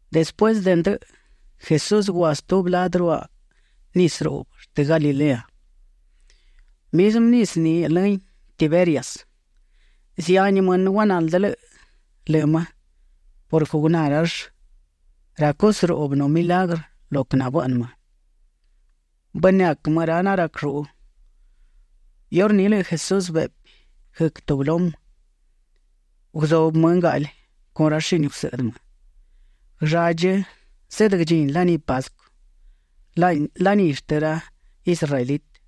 Despuësë de ndëꞌë, Jesús gua stubi ladë ruaꞌ nisë ruꞌbë shtë Galilea; mizmë nisë ni lëhin Tiberias. Zihani mënë guanaldë lëꞌë më purquë guná rall ra cusë ruꞌbë nu milagrë lo quë nabëꞌnë më. Bënëac më ra narac lluꞌu. Iurní lëꞌë Jesús beꞌpi guëc tubi lumë. Guzubë më ngaꞌli con ra shini gusëꞌdë më. Guëlladchi zeꞌdë guëdchini laní Pascu, laní shtë ra israelitë.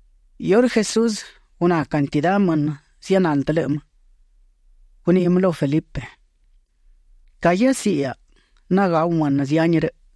Iurë Jesús guná cantidá mënë zianaldë lëꞌë më, guniꞌi më lu Felipe: ―¿Ca guiasiꞌi hiaꞌa nagáu mënë zihani rëꞌ?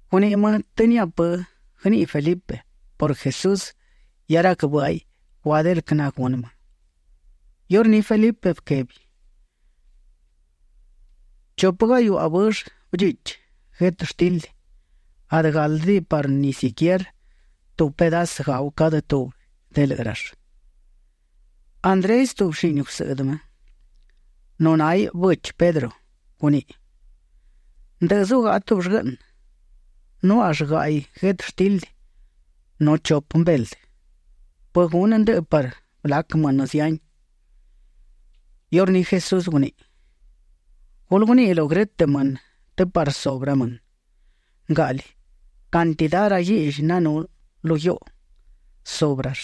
Guniꞌi më të niaꞌa pë guëniꞌi Felipe purquë Jesús hia rac bë́ꞌaiꞌ guadë el quë nagunë më. Iurní Felipe bëquebi: ―Chupë gahiuꞌa bëllë bëdchichi guetështildi, adë gáldëdiꞌi parë ni siquierë tubi pedasë gau cadë tubi de lëꞌë rall. Andrés, tubi shini gusëꞌdë më, nu náhiꞌ bëchi Pedro; guniꞌi: ―Ndë zugaꞌa tubi llguëꞌnë. Nuáꞌall gaꞌi guetështildi nu chupë mbeldë, ¿pë gunë ndëꞌë parë blac mënë zihani? Iurní Jesús guniꞌi: ―Gulë guniꞌi lu grë́tëꞌ mënë të parë subë ra mënë. Ngaꞌli cantidá ra guiꞌlli nanú lu guiuꞌu, subë rall.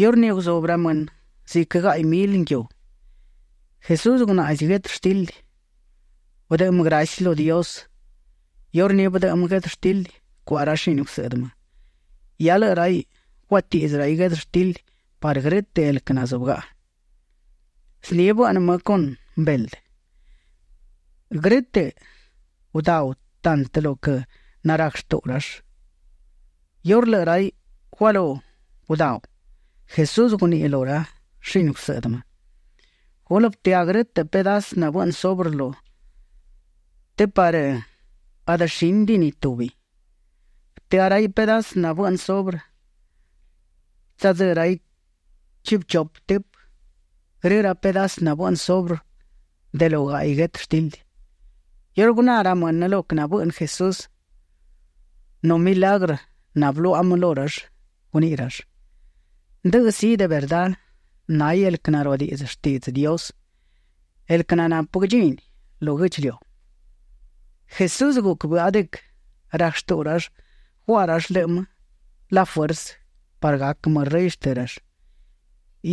Iurní guzubë ra mënë ziquë gaꞌi mili nguiu. Jesús gunaꞌzi guetështildi. Bëdëꞌë më graci lu Dios. Iurní bëdëꞌë më guetështildi cuaꞌa ra shini gusëꞌdë më. Hia lëꞌë raiꞌ guatiꞌdzë raiꞌ guetështildi parë grë́tëꞌ el quë nazúbëgaꞌa. Zni bëꞌnë më con mbeldë. Grë́tëꞌ gudáu tantë lo quë narac shtuꞌu rall. Iurë lëꞌë raiꞌ gualú gudáu, Jesús guniꞌi lu ra shini gusëꞌdë më: ―Gulë bëtëá grë pedasë nabëꞌnë subrë të parë adë shínidiꞌi ni tubi. Bëtëá raiꞌ pedasë nabëꞌnë subrë; tsadzë́ raiꞌ chiꞌbë chupë tëpë grë ra pedasë nabëꞌnë subrë de lo gaꞌi guetështildi. Iurë guná ra mënë lo quë nabëꞌnë Jesús nu milagrë nabëluaꞌa më lu rall, guniꞌi rall: ―Ndëꞌë sí, de verdá náhiꞌ el quë naruadiꞌdzë shtiꞌdzë Dios, el quë nanapë quë guëdchini lu guë́ꞌdchiliu. Jesús guc bëꞌa de quë rac shtuꞌu rall guaꞌa rall lëꞌë më la fuersë parë gac më rëy shtë rall.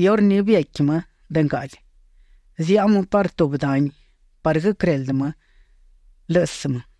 Iurní biequi më de ngaꞌli. Ziaꞌa më parë tubi dani parë guëquëreldë më lë́ꞌësë më.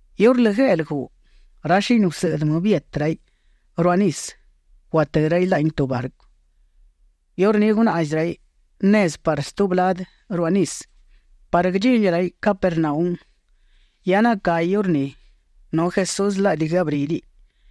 Iurë lëꞌë gueꞌlë guꞌ, ra shini gusëꞌdë më bietë raiꞌ ruaꞌ nisë. Guatë́ raiꞌ laꞌni tubi barcu. Iurní gunaꞌzi raiꞌ nezë parë stubi ladë ruaꞌ nisë parë guëdchini raiꞌ Capernaum, Hia nacahi iurní, nu Jesús laꞌdi guëabrídiꞌiꞌ.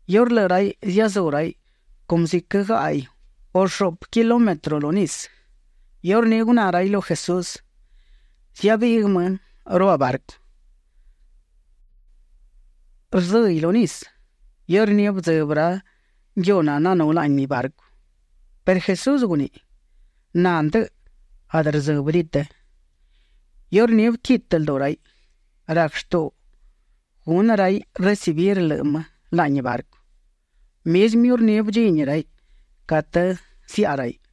Iurë lëꞌë raiꞌ ziazú raiꞌ cumë ziquë gaꞌi u shuꞌpë kilómetro lu nisë, iurní guná raiꞌ lu Jesús; ziabiꞌguë më ruaꞌ barcu. Rzë́hiꞌ lu nisë. Iurní bëdzëbë ra nguiu nananú laꞌni barcu perë Jesús guniꞌi: ―Na ndëꞌë; adë rdzë́bëdiꞌi të. Iurní bëquitë lduꞌu raiꞌ; rac shtuꞌu gunë raiꞌ recibir lëꞌë më laꞌni barcu. Mizmë iurní bëdchini raiꞌ catë ziaꞌa raiꞌ.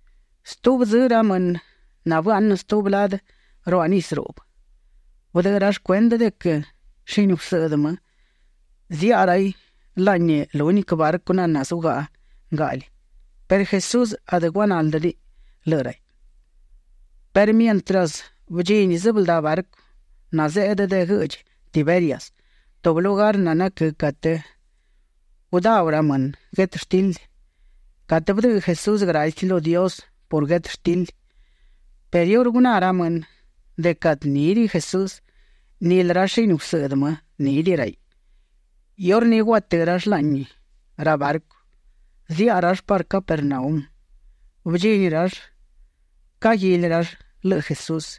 Stubi dzë ra mënë nabëaꞌnë stubi ladë ruaꞌ nisë ruꞌbë, bëdëꞌë rall cuendë de quë shini gusëꞌdë më ziaꞌa raiꞌ laꞌni lúniquë barcu naná zugaꞌa ngaꞌli perë Jesús adë guanáldëdiꞌiꞌ lëꞌë raiꞌ. Perë mientras bëdchini sëbëldá barcu nazeꞌdë de guëꞌdchi Tiberias, tubi lugar nanaquë́ catë gudáu ra mënë guetështildi, catë bëdëꞌë Jesús graci lu Dios por guetështildi. Perë iurë guná ra mënë de quë adë nídiꞌi Jesús, nilë ra shini gusëꞌdë më nídiꞌi raiꞌ; iurní guatë́ rall laꞌni ra barcu. Ziaꞌa rall parë Capernaum. Bëdchini rall; caguili rall lëꞌë Jesús.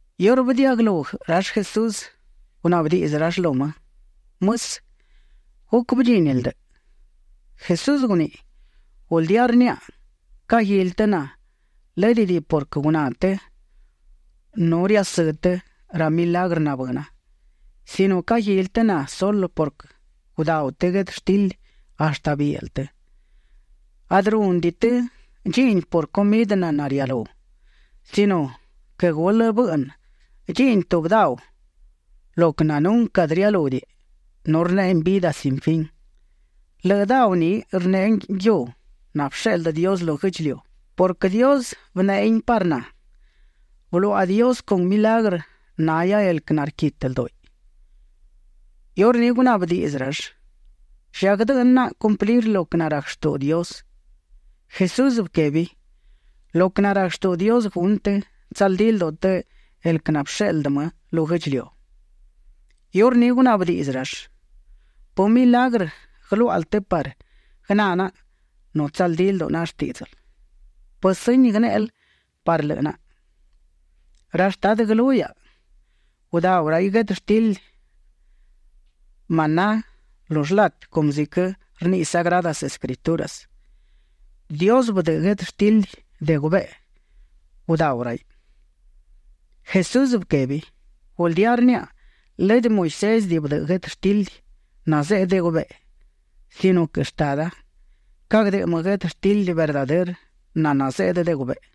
Iurë bëdiaꞌguëlú rall Jesús, gunaꞌbë diꞌdzë rall lu më: ―Mësë, ¿guc bëdchínil ndëꞌë? Jesús guniꞌi: ―Guldía rniaꞌa, caguili të na, lë́dëdiꞌi purquë guná të nu riasë́ të ra milagrë nabëna, sino caguili të na sulë purquë gudáu të guetështildi hashtë bielë të. Adë rúnëdiꞌi të dchiꞌni por cumidë naná rialú sino quë gulë bëꞌnë dchiꞌni tubi dau lo quë nunquë adë rialúdiꞌi nu rneꞌein vidë sin fin. Lëꞌë dau ni rneꞌe nguiu nabësheꞌldë Dios lu guë́ꞌdchiliu, purquë Dios bëneꞌein parë na. Bëluaꞌa Dios con milagrë nahia el quë narquitë ldúꞌiꞌ. Iurní gunaꞌbë diꞌdzë rall: ―¿Lla guëdëꞌnë naꞌa cumplir lo quë narac shtuꞌu Dios? Jesús bëquebi: ―Lo quë narac shtuꞌu Dios gunë të, tsaldí lduꞌu të el quë nabësheꞌldë më lu guë́ꞌdchiliu. Iurní gunaꞌbë diꞌdzë rall: ―¿Pë milagrë guëluáꞌal të parë guëná naꞌa nu tsaldí lduꞌu naꞌa shtíꞌdzël? ¿Pë sëñi guënéꞌel parë lëꞌë naꞌa? Ra shtadë guëlú hiaꞌa gudáu raiꞌ guetështildi maná lu shlatë cumë ziquë rniꞌi Sagradas Escrituras: “Dios bëdëꞌë guetështildi de gubeꞌe; gudáu raiꞌ”. Jesús bëquebi: ―Guldía rniaꞌa, lëdë Moisés bëdëꞌë guetështildi nazeꞌdë de gubeꞌe sino quë Shtada; cagdëꞌë më guetështildi verdadërë naná zeꞌdë de gubeꞌe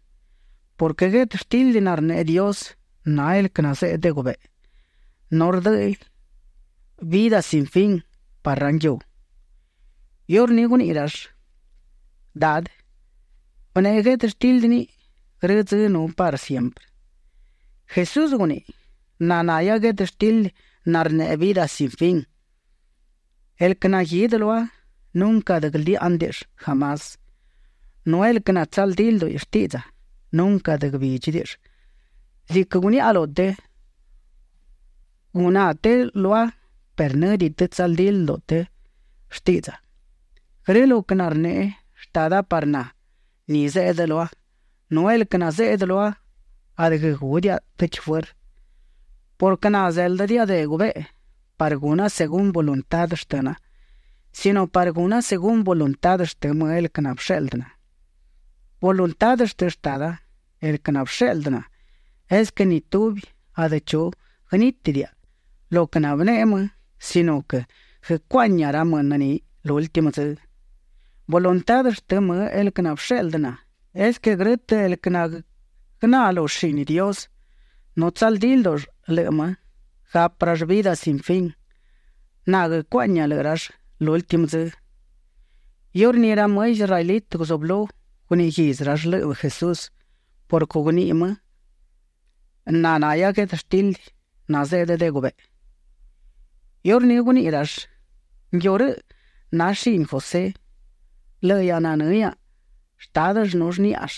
purquë guetështildi narneꞌe Dios, na el quë nazeꞌdë de gubeꞌe. Nu rdë́ꞌëiꞌ vidë sin fin parë ra nguiu. Iurní guniꞌi rall: ―Dadë, bëneꞌe guetështildi niꞌi grë dzë nu parë siemprë. Jesús guniꞌi: ―Na nahia guetështildi narneꞌe vidë sin fin. El quë naguidë lua, nunquë adë guëldiáꞌnëdiꞌill jamás. Nu el quë natsaldí lduꞌi shtiꞌdza, nunquë adë guëbídchidiꞌill. Ziquë guniaꞌa lu të, guná të lua perë në́diꞌi të tsaldí lduꞌu të shtiꞌdza. Grë lo quë narneꞌe Shtada parë na, ni zeꞌdë lua, nu el quë nazeꞌdë lua adë guëgúdiaꞌa tëchi fuërë purquë na zéldëdiaꞌa de gubeꞌe parë guna según voluntá shtëna sino parë guna según voluntá shtë më el quë nabësheꞌldë na. Voluntá shtë Shtada, el quë nabësheꞌldë na, es quë ni tubi adë chu guënítidiaꞌa lo quë nabëneꞌe më sino quë guëcuaꞌñia ra mënë ni lúltimë dzë. Voluntá shtë më el quë nabësheꞌldë na, es quë grë́tëꞌ el quë naguëná lu shini Dios nu tsaldí ldúꞌull lëꞌë më, gapë rall vidë sin fin. Na guëcuaꞌñia lëꞌë rall lúltimë dzë. Iurní ra më israelitë guzublú guniꞌi guidzë rall lëꞌë Jesús purquë guniꞌi më: “Na nahia guetështildi nazeꞌdë de gubeꞌe”. Iurní guniꞌi rall: ―Nguiu rëꞌ na shini José. Lëꞌë hiaꞌa nanë́ hiaꞌa shtádëll nu shníꞌall.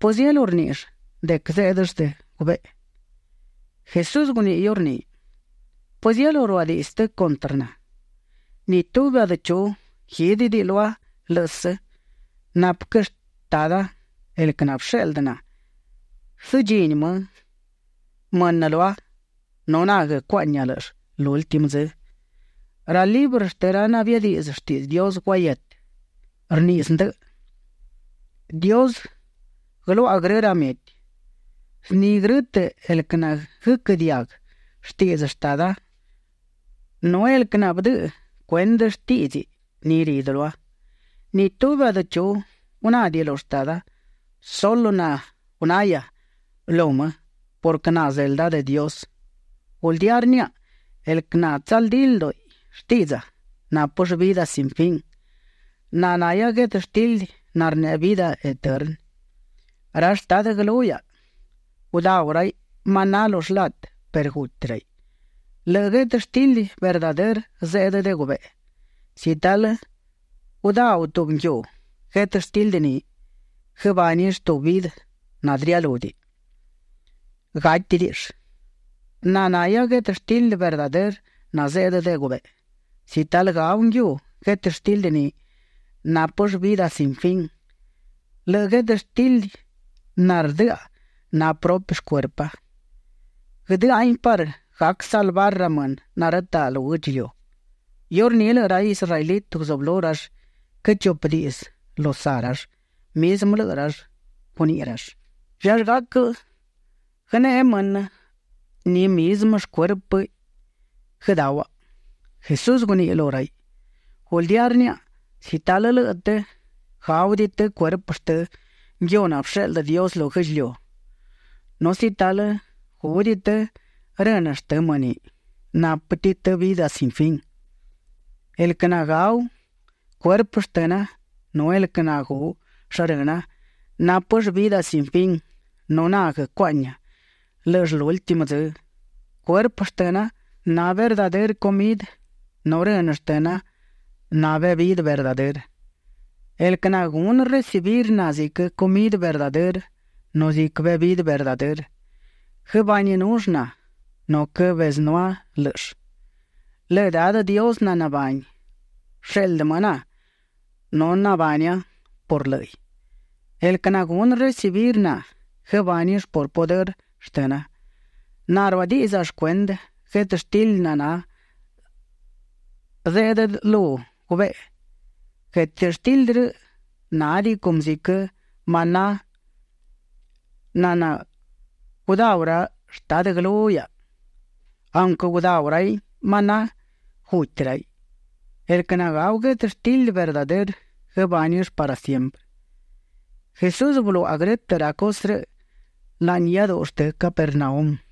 ¿Pëzielú rníꞌill de quë zéꞌdëll de gubeꞌe? Jesús guniꞌi iurní: ―¿Pëzielú ruadiꞌdzë të cuntrë na? Ni tubi adë chu guídëdiꞌi lua lë́ꞌësë, napë quë Shtada, el quë nabësheꞌldë na, guësëdchini më mënë lua, nu na guëcuaꞌñia lë́ꞌëll lúltimë dzë. Ra librë shtë ra nabiadiꞌdzë shtiꞌdzë Dios guahietë, rniꞌi zdëꞌë: “Dios guëluaꞌa grë ra mieti”. Zni grë́tëꞌ el quë naguëquë́ diaguë shtiꞌdzë Shtada nu el quë nabëdëꞌë cuendë shtíꞌdziꞌ, ni ridë lua. ’Ni tubi adë chu gunádiꞌi lu Shtada; sulë na gunahia lu më purquë na zelda de Dios. Guldía rniaꞌa, el quë natsaldí lduꞌi shtiꞌdza, nápëll vidë sin fin. Na nahia guetështildi narneꞌe vidë eternë. Ra shtadë guëlú hiaꞌa gudáu raiꞌ maná lu shlatë perë guti raiꞌ. Lëꞌë guetështildi verdadërë zeꞌdë de gubeꞌe; si talë gudáu tubi nguiu guetështildi ni, guëbánill tubi vidë nanadë rialúdiꞌi; gátidiꞌill. Na nahia guetështildi verdadërë nazeꞌdë de gubeꞌe. Si talë gau nguiu guetështildi ni, nápëll vidë sin fin. Lëꞌë guetështildi nardëꞌa na prupi shcuerpa. Guëdë́ꞌahin parë gac salvar ra mënë narëtaꞌ lu guë́ꞌdchiliu. Iurní lëꞌë ra israelitë guzublú rall quëchupë diꞌdzë lu saꞌ rall, mizmë lëꞌë rall. Guniꞌi rall: ―¿Llallë gac guëneꞌe mënë ni mizmë shcuérpiꞌ guëdáuhaꞌa? Jesús guniꞌi lu raiꞌ: ―Guldía rniaꞌa, si talë lëꞌë të gáudiꞌi të cuerpë shtë nguiu nabësheꞌldë Dios lu guë́ꞌdchiliu, nu si talë gúdiꞌi të rënë shtënë më ni, nápëdiꞌi të vidë sin fin. El quë nagáu cuerpë shtëna nu el quë nagú shrëna, nápëll vidë sin fin, nu na guëcuaꞌñia lë́ꞌëll lúltimë dzë. Cuerpë shtëna na verdadërë cumidë nu rënë shtëna na bebidë verdadërë. El quë nagunë recibir na ziquë cumidë verdadërë nu ziquë bebidë verdadërë, guëbaninull na, nu quëbezënúa lë́ꞌëll. Lëꞌë Dadë Dios nanabani, bësheꞌldë më na, nu nabania por lë́ꞌiꞌ. El quë nagunë recibir na, guëbánill por pudërë shtëna. Na ruadiꞌdza shcuendë guetështildi naná zeꞌdë lu gubeꞌe. Guetështildi rëꞌ nádiꞌi cumë ziquë maná naná gudáu ra shtadë guëlú hiaꞌa; aunquë gudáu raiꞌ maná, guti raiꞌ. El quë nagáu guetështildi verdadërë, guëbánill parë siemprë. Jesús bëluaꞌa grë́tëꞌ ra cusë rëꞌ laꞌni iáduꞌu shtë Capernaum.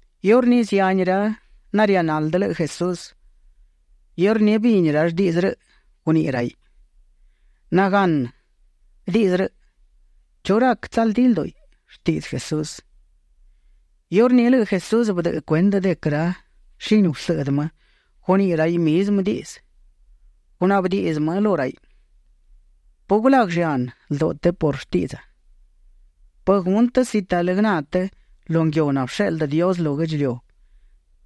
Iurní zihani ra narianaldë lëꞌë Jesús, iurë bini rall diꞌdzë rëꞌ, guniꞌi raiꞌ: ―Naganë diꞌdzë rëꞌ. ¿Chu rac tsaldí lduꞌu shtiꞌdzë Jesús? Iurní lëꞌë Jesús bëdëꞌë cuendë de quë ra shini gusëꞌdë më guniꞌi raiꞌ mizmë diꞌdzë; gunaꞌbë diꞌdzë më lu raiꞌ: ―¿Pë gulaguë llanë lduꞌu të por shtiꞌdza? ¿Pë gunë të si talë guëná të lu nguiu nabësheꞌldë Dios lu guë́ꞌdchiliu,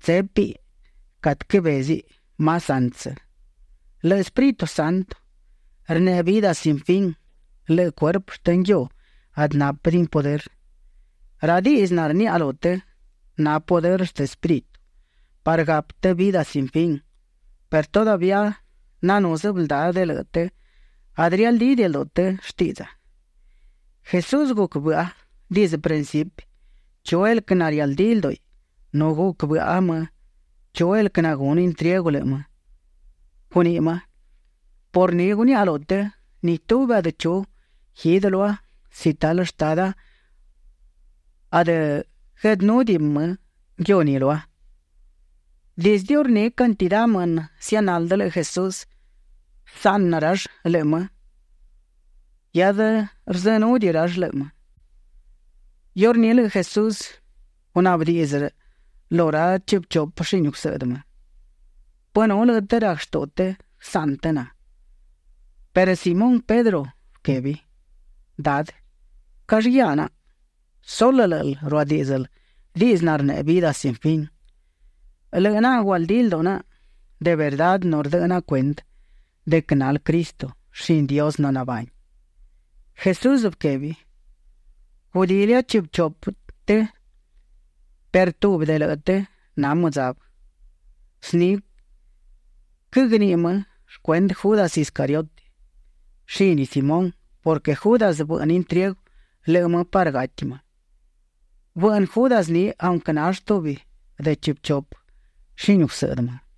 tsépiꞌ catë cabéziꞌ más antsë? Lëꞌë Espíritu Santo rneꞌe vidë sin fin; lëꞌë cuerpë shtë nguiu adë nápëdiꞌin pudërë. Ra diꞌdzë narniaꞌa lu të, na pudërë shtë Espíritu parë gapë të vidë sin fin. Perë todavía nanú sëbëldá de lëꞌë të, adë rialdídiꞌi lduꞌu të shtiꞌdza. Jesús guc bëꞌa dizdë principi chu el quë narialdídiꞌi lduꞌi nu guc bëꞌa më chu el quë nagunë intriegu lëꞌë më. Guniꞌi më: ―Por ni guniaꞌa lu të, ni tubi adë chu guidë lua si talë Shtada adë gueꞌdënúdiꞌi më nguiu ni lua. Dizdë iurní cantidá mënë nazianaldë lëꞌë Jesús, bësaꞌnë rall lëꞌë më; hiadë rzënúdiꞌi rall lëꞌë më. Iurní lëꞌë Jesús gunaꞌbë díꞌdziꞌ lu ra chiꞌbë chupë shini gusëꞌdë më: ―¿Pë nu lëꞌë të rac shtuꞌu të guësaꞌnë të na? Perë Simón Pedro bëquebi: ―Dadë, ¿callë guiá naꞌa? Sulë lë́ꞌël ruadíꞌdzël diꞌdzë narneꞌe vidë sin fin. Lëꞌë naꞌa gualdí lduꞌu naꞌa de verdá nu rdëꞌë naꞌa cuendë de quë nal Cristo, shini Dios nanabani. Jesús bëquebi: ―Gudilia chiꞌbë chupë të perë tubi de lëꞌë të na mëdzabë. Zni quëgniꞌi më shcuendë Judas Iscariote, shini Simón purquë Judas bëꞌnë intriegu lëꞌë më parë gati më. Bëꞌnë Judas ni aunquë nall tubi de chiꞌbë chupë shini gusëꞌdë më.